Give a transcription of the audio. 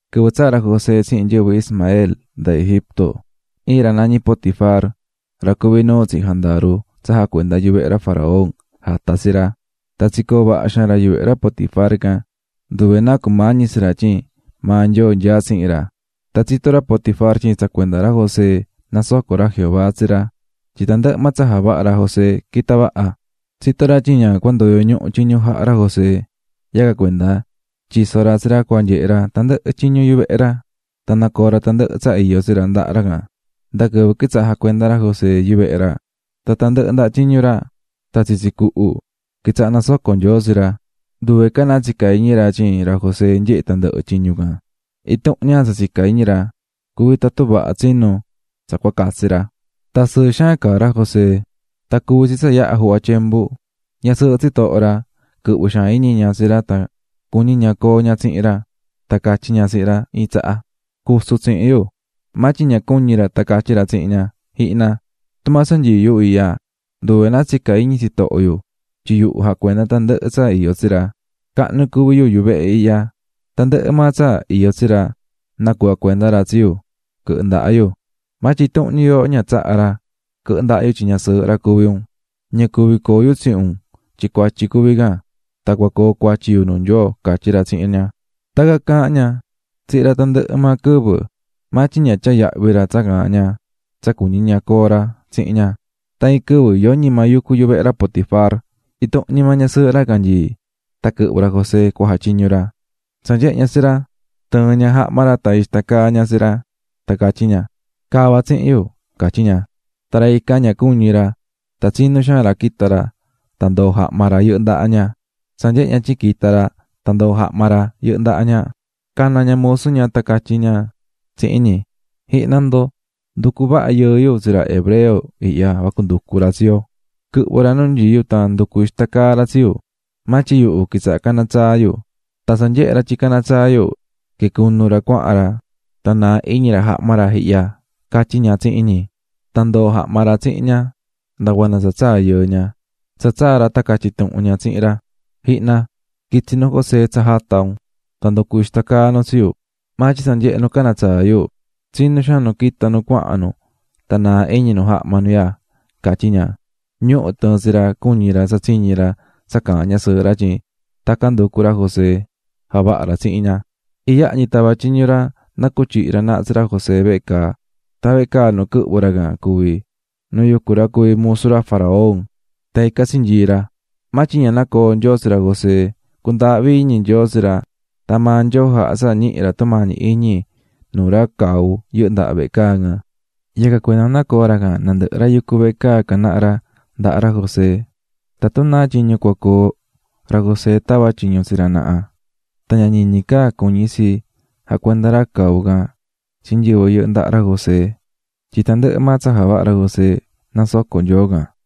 Quɨvɨ tsaa̱ ra José tsihin nyɨvɨ Ismael nda Egipto, iin ra nañí Potifar, ra cuví nuu tsihin jandaru tsa jacuendá yuvehe ra faraón, jata̱ ra tsi ra. Tan tsicoo̱ vaha xaan ra yuvehe ra Potifar can, nduve náa cumañí tsi ra tyin maa Nyoo nyaá tsihin ra. Tan tsitó ra Potifar tyin tsa cuenda ra José nasocó ra Jehová tsi ra, tyin tandɨhɨ maa tsa javahá ra José quitá vaha. Tsitó ra tyin ña cua ndoyo ñuhu tyiñu jaha ra José, yacan cuenda tyiso̱ ra tsi ra cua nyehe ra tandɨhɨ tyiñu yuvehe ra tan nacoo̱ ra tandɨhɨ tsa iyó tsi ra ndaha ra can. Nda quɨvɨ quitsaha̱ jacuendá ra José yuvehe ra, tan tandɨhɨ ndaha tyiñu ra tan tsitsi cuhu, quitsaha̱ nasocó Nyoo tsi ra. Nduve ca náa tsicá iñi ra tyin ra José nyehé tandɨhɨ tyiñu can, intuhun ña tsa tsicá iñi ra cuví tatun vaha tsinú tsa cua catsi ra. Tan sɨɨ xaan caá ra José. Tan cuvi̱ tsi tsa yaha̱ juhva tyembu, ñasɨɨhɨ tsitoho ra, quɨhvɨ̱ xaan iñi ña tsi ra tan cuñí ña coo ña tsihin ra, tan catyí ña tsihin ra iin tsaha: --Cu̱su tsihin yu. Maa tyin ña cuñi̱ ra tan catyí ra tsihin ña: --Ji̱hna, tumaa tsa nyií yu ihya, nduve náa tsicá iñi tsitoho yu, tyin yuhu jacuendá tandɨhɨ tsa iyó tsi ra. Cahnu cuví yuhu yuvehe ihya, tandɨhɨ maa tsa iyó tsi ra nacuhva̱ cuenda ra tsi yu quɨhɨ ndaha yu, maa tyin intuhun ñi yooho ña tsaha ra quɨhɨ ndaha yu tyin ñasɨɨhɨ ra cuví un. Ña cuví coo yu tsihin un tyin cuatyi cuví can, tan coo cuatyi yu nuu Nyoo --catyí ra tsihin ña. Tacan caahán ña tsihin ra tandɨhɨ maa quɨvɨ, maa tyin ña tyaá yahvi ra tsa caahán ña tsa cuñí ña coo ra tsihin ña. Tan iin quɨvɨ yoñi maa yucú yuvehe ra Potifar intuhun ñi maa ñasɨɨhɨ ra can nyií tan quɨhvɨ̱ ra José cua jatyiñu ra. Tsa nyehe̱ ña tsi ra tɨɨ̱n ña jahma ra tan ixta caa̱ ña tsi ra tan catyí ña: --Ca̱va tsihin yu --catyí ña. Tan ra ican ña cuñi̱ ra tan tsinú xaan ra quita̱ ra tan ndoo̱ jahma ra yɨhɨ́ ndaha ña. Tsa nyehe̱ ña tyin quita̱ ra, tan ndoo̱ jahma ra ndahá ña, cana̱ ña musu ña tan catyí ña tsihin ñi: --Ji̱hna ndo, nducu̱ vaha yɨɨ yu tsi ra hebreo ihya vacu nducu tsi yo, quɨhvɨ̱ ra nu nyií yu tan nducu̱ ixta caa ra tsi yu, maa tyin yuhu quitsaha̱ caná tsaa yu. Tan tsa nyehe̱ ra tyin caná tsaa yu quicunu̱ ra cuahan ra tan naa̱ iñi ra jahma ra ihya --catyí ña tsihin ñi. Tan ndoo̱ jahma ra tsihin ña nda cuanda tsa tsaa̱ nuhu yɨɨ ña. Tsa tsaa̱ ra tan catyí ña tsihin ra: --Ji̱hna, quitsi̱ nu José tsa jata̱ un, tan nducu̱ ixta caa nu tsi yu. Maa tyin tsa nyehe̱ nu caná tsaa yu tsinú xaan nu quita̱ nu cuahan nu tan naa̱ iñi nu jahma nu ihya ―catyí ña. Ñuhu̱ tɨɨ̱n tsi ra cuñí ra tsa tsiñi̱ ra tsa caahán ñasɨɨhɨ ra tyin tacan nducu̱ ra José javaha̱ ra tsihin ña. Iyaha ñi tava̱ tyiñu ra na cutyihi ra naha tsi ra José vehe caa. Tan vehe caa nu quɨhvɨ̱ ra can cuví nu yucú ra cuvi̱ musu ra faraón. Tan ican tsinyii̱ ra. Maa tyin ña nacoo̱ Nyoo tsi ra José, cundaahví iñi Nyoo tsi ra, tan maa Nyoo jaha̱ tsa ñihi̱ ra tumañi iñi nuu ra cau yɨhɨ́ ndaha vehe caa can. Yacan cuenda nacoo̱ ra can nandɨhɨ ra yucú vehe caa can naha ra ndaha ra José, tatun náa tyiñu cua coo, ra José tavá tyiñu tsi ra naha. Tan ña ñiñi ca cuñí tsi jacuendá ra cau can tsi nyɨvɨ yɨhɨ́ ndaha ra José tyin tandɨhɨ maa tsa javahá ra José nasocó Nyoo can.